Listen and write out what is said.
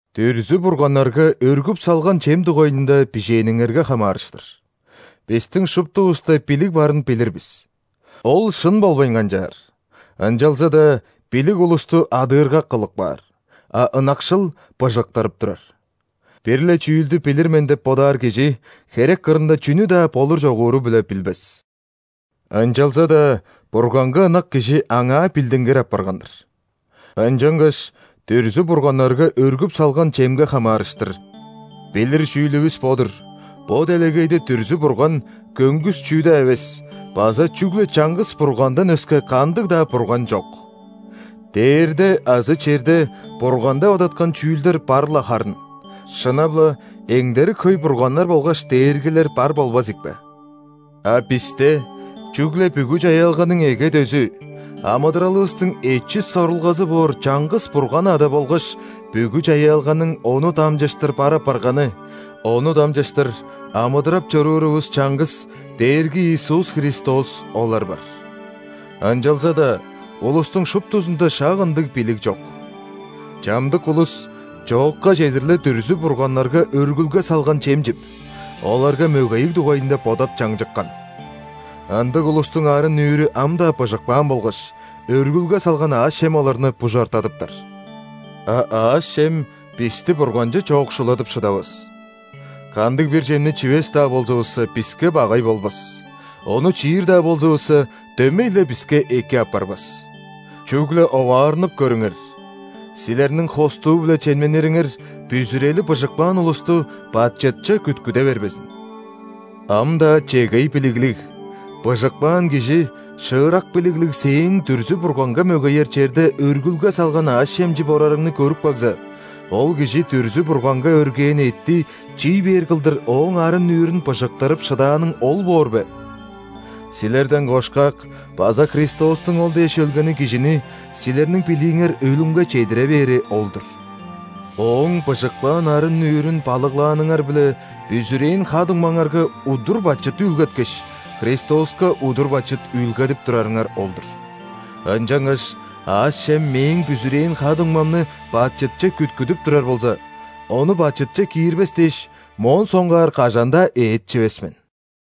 Дүрзү-бурганнарга өргүп салган чем дугайында бижээниңерге хамаарыштыр. «Бистиң шуптувуста билиг барын билир бис». Ол шын болбайн канчаар, ынчалза-даа билиг улусту адыыргак кылып каар, а ынакшыл быжыктырып турар. Бир-ле чүүлдү билир мен деп бодаар кижи херек кырында чүнү-даа болур-чогууру-биле билбес. Ынчалза-даа Бурганга ынак кижи Аңаа билдингир апарган-дыр. Ынчангаш дүрзү-бурганнарга өргүп салган чемге хамаарыштыр: «Билир чүүлүвүс бо-дур: бо делегейде дүрзү-бурган – көңгүс чүү-даа эвес база чүгле чаңгыс Бургандан өске кандыг-даа бурган чок. Дээрде азы черде бурган деп адаткан чүүлдер бар-ла харын (шынап-ла, эңдерик хөй „бурганнар“ болгаш „дээргилер“ бар болбазыкпе). А бисте чүгле бүгү чаяалганың эге-дөзү, амыдыралывыстың эчис сорулгазы боор чаңгыс Бурган Ада болгаш бүгү чаяалганың Ону дамчыштыр бар апарганы, Ону дамчыштыр амыдырап чоруурувус чаңгыс Дээрги Иисус Христос олар бар». Ынчалза-даа улустуң шуптузунда шак ындыг билиг чок. Чамдык улус чоокка чедир-ле дүрзү-бурганнарга өргүлге салган чем чип, оларга мөгейиг дугайында бодап чаңчыккан. Ындыг улустуң арын-нүүрү ам-даа быжыкпаан болгаш, өргүлге салган аъш-чем оларны бужартадыптар. «А аъш-чем бисти Бурганче чоокшуладып шыдавас. Кандыг-бир чемни чивес-даа болзувусса, биске багай болбас, ону чиир-даа болзувусса, дөмей-ле биске эки апарбасR». Чүгле оваарнып көрүңер: силерниң хостуу-биле чемненириңер бүзүрели быжыкпаан улусту бачытче күткүде бербезин. Ам-даа чегей билиглиг, быжыкпаан кижи шыырак билиглиг сээң дүрзү-бурганга мөгеер черде өргүлге салган аъш-чем чип орарыңны көрүп кагза, ол кижи дүрзү-бурганга өргээн эътти чий бээр кылдыр ооң арын-нүүрүн «быжыктырып» шыдааның ол боор бе? Силерден кошкак база Христостуң ол дээш өлгени кижини силерниң билииңер өлүмге чедире бээри ол-дур. Ооң быжыкпаан арын-нүүрүн балыглааныңар-биле бүзүрээн ха-дуңмаңарга удур бачыт үүлгеткеш, Христоска удур бачыт үүлгедип турарыңар ол-дур. Ынчангаш аъш-чем мээң бүзүрээн ха-дуңмамны бачытче күткүдүп турар болза, ону бачытче киирбес дээш, моон соңгаар кажан-даа эът чивес мен.